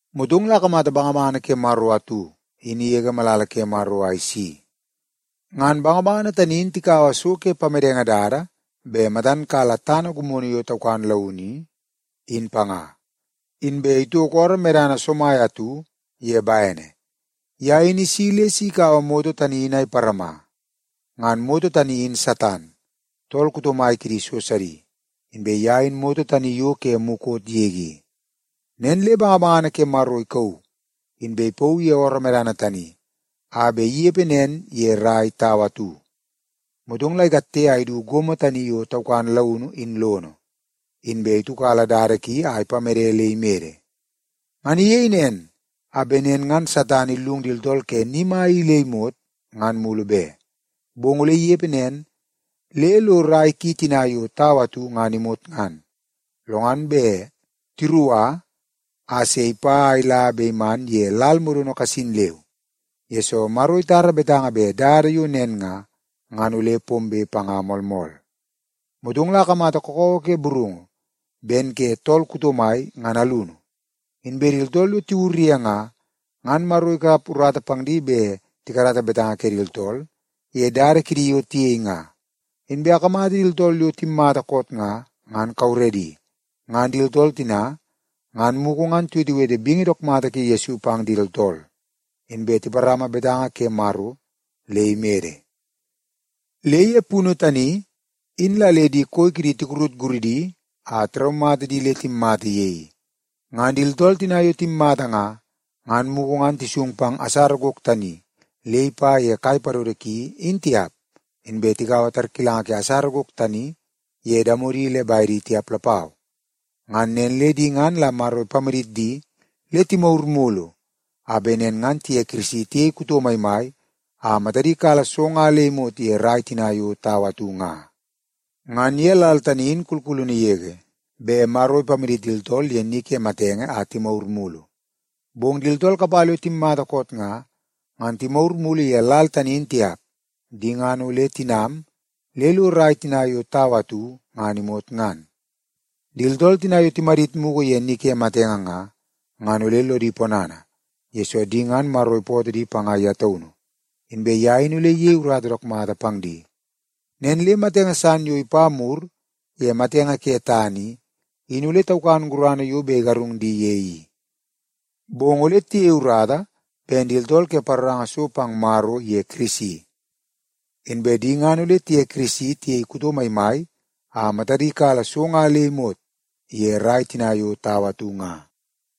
Motong la akamata bangabangana ke Maro atu in igege malala ke Maro a isi. Ngan bangabangana tani in tikaua so ke pamedenge dada bet matan kala tana gimono yo taukan launu i, in panga, inbe itoko ooroo medana somai atu ye bene. Ye in isi le si ikaua moto tani in a iparama. Ngan moto tani in Satan, tool kuto mai kidi so sidi, inbe ye in moto tani yo ke mukot yege i. Nen le bangabangana ke Maro ikauu, inbe ipauu ye ooroo medana tani a bet inepe nen ye rai tau atu. Motong la ikatte a idu gomo tani yo taukan launu in lono, inbe itiukala dada ki a ipamede le imede. Ngan iyei nen a bet nen ngan Satan illung di tooltool ke ni mai i le imot, ngan mulu be. Bong ole inepe nen le lo rai ki tina yo tau atu ngan imot ngan, lo ngan bet tiruka a se ipa a ila be iman ye lal modono kasin leu, yesoo Maro itara betanga bet dada yo nen nga, ngan ole pombe panga moolmool. Motong la akamata kakawa ke burungu ben ke tool kuto mai ngan alunu. Inbe di tooltool yo tiwur ye nga, ngan Maro ikap urata pang di bet tikarata betanga kidi tooltool ye dada kidi yo tiyei nga. Inbe akamata di tooltool yo timmata koot nga, ngan kauredi. Ngan di tooltool tina ngan mugu ngan tiwetewete bingi dook mata ke Yesu pang di tooltool, inbe tiparama betanga ke Maro le imede. Le ye punu tani in la le di koi kidi tikurut guridi a tiraumata di le timmata ye i. Ngan di tooltool tina yo timmata nga, ngan mugu ngan tisung pang asara gok tani le ipa ye kai padodo ki in tiap, inbe tikaua tarkilanga ke asara gok tani ye damodi le bedi tiap lapau. Ngan nen le di ngan la Maro ipamadit di le timagur mulu a bet nen ngan tiye Kirisi tiyei kuto maimai a matadi kala so nga le imot ye rai tina yo tau atu nga. Ngan ye lal tani in kulkulunu yege bet Maro ipamadit di tooltool ye ni ke matenge a timagur mulu. Bong di tooltool kapala yo timmata koot nga, ngan timagur mulu ye lal tani in tiap. Di ngan ole tinam le lo rai tina yo tau atu ngan imot ngan. Di tooltool tina yo timadit mugu ye ni ke matenge nga, ngan ole lodi ponana, yesoo di ngan Maro ipootoo di panga ye taunu, inbe ye in ole iyei urata dook mata pang di. Nen le matenge san yo ipa mur ye matenge ke tana i, in ole taukan gurana yo bet igarung di ye i, bong ole tiyei urata ben di tooltool ke paroranga so pang Maro iye Kirisi. Inbe di ngan ole tiye Kirisi tiyei kuto maimai a matadi kala so nga le imot ye rai tina yo tau atu nga.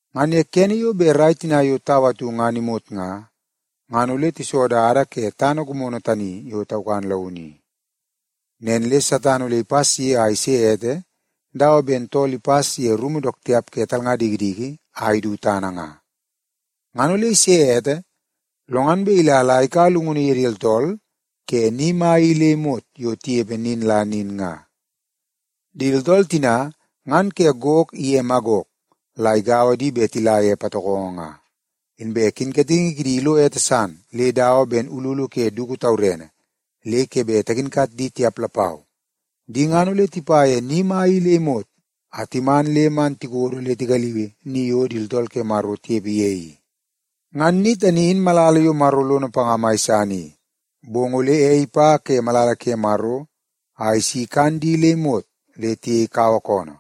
Ngan kene yo bet rai tina yo tau atu ngan imot nga, ngan ole tiso dada ke gomo tani yo taukan launu i. Nen le Satan ole ipas ye a ise ete dawa ben tool ipas ye rumu dook tiap ke di talnga dikidiki a idu tana nga. Ngan ole ise ete, lo ngan bet ila la ikaua llungunu ye di tooltool ke ni mai i le imot yo tinepe nin la nin nga. Di tooltool tina ngan ke Gok iye Magok la igaua di bet tila ye patokongo nga. Inbe kinkatingi kidi ilo ete san le dawa ben ululu ke dugu tawarene le ke bet takinkat di tiap lapau. Di ngan ole tipa ye ni mai i le imot a timan le man tikodo le tigaliui ni yo di tooltool ke Maro tinepe ye i. Ngan ni tani in malala yo Maro lono panga mai san i. Bong ole ei ipa ke malala ke Maro a isi ikan di le imot le tiyei kawa koonoo.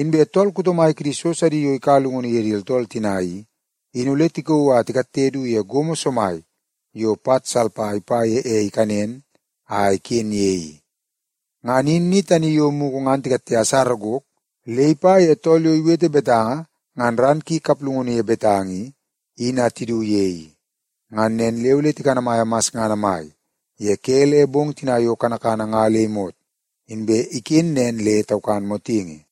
Inbe tool kuto mai kidi so sidi yo ikaua llungunu ye di tooltool tina i, in ole tikauu a tikatte du ye gomo somai yo pat salpa ipa ye ei ikanen a iken ye i. Ngan in ni tani yo mugu ngan tikatte asara gok le ipa ye tool yo iwete betanga ngan ran ki kaplungunu ye betanga i, in a tidu ye i. Ngan nen le ole tikanamaia masngana mai ye ke le bong tina yo kanakana nga le imot inbe iken nen le taukan motingi.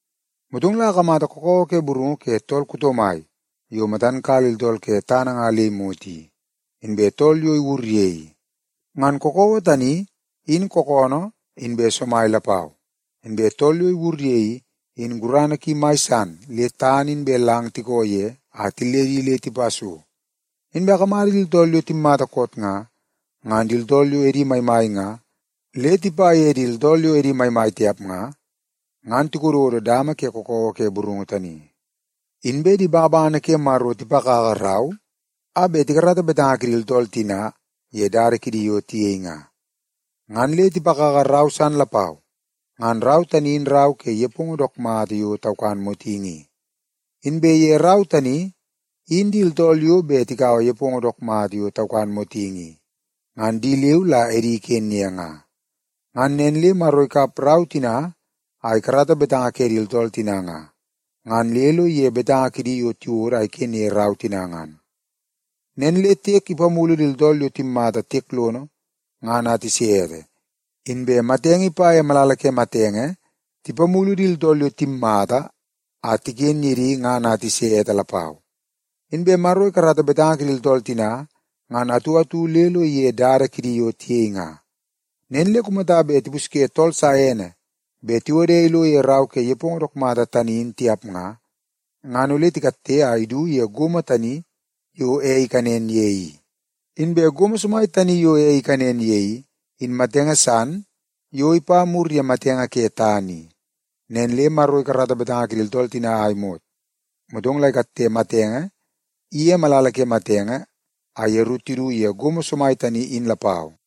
Motong la akamata kakawa ke burungu ke tool kuto mai yo matan kala di tooltool ke tana nga le imot i, inbe tool yo iwur ye i. Ngan kakawa tani in kookoonoo inbe somai lapau, inbe tool yo iwur ye i, in gurana ki mai san le tana inbe lang tikoo ye a tilledi le tipa so. Inbe akamata di tooltool yo timmata koot nga, ngan di tooltool yo edi maimai nga le tipa ye di tooltool yo edi maimai tiap nga, ngan tikododo dama ke kakawa ke burungu tani. Inbe di bangabangana ke Maro tipakaka rau a bet tikarata betanga kidi tooltool tina ye dada kidi yo tiyei nga. Ngan le tipakaka rau san lapau, ngan rau tani in rau ke nepongo dook mata yo taukan motingi i. Inbe ye rau tani in di tooltool yo bet tikaua nepongo dook mata yo taukan motingi i, ngan di leu la edi iken ye nga. Ngan nen le Maro ikap rau tina a ikarata betanga ke di tooltool tina nga, ngan le lo ige betanga kidi yo tiwodo a iken ye rau tina ngan. Nen le tiek ipamulu di tooltool yo timmata tiek lono ngan a tise ete, inbe matenge iye malala ke matenge tipamulu di tooltool yo timmata a tiken ye di ngan a tise ete lapau. Inbe Maro ikarata betanga kidi tooltool tina ngan atu atu le lo ige dada kidi yo tiyei nga. Nen le kumata le tipusye tool sa ene bet tiwode ilo ye rau ke nepongo dook mata tani in tiap nga, ngan ole tikatte a idu ye gomo tani yo ei ikanen ye i. Inbe gomo somai tani yo ei ikanen ye i, in matenge san yo ipa mur ye matenge ke tana i. Nen le Maro ikarata betanga kidi tooltool tina a imot, motong la ikatte matenge iye malala ke matenge a yeru tidu ye gomo somai tani in lapau.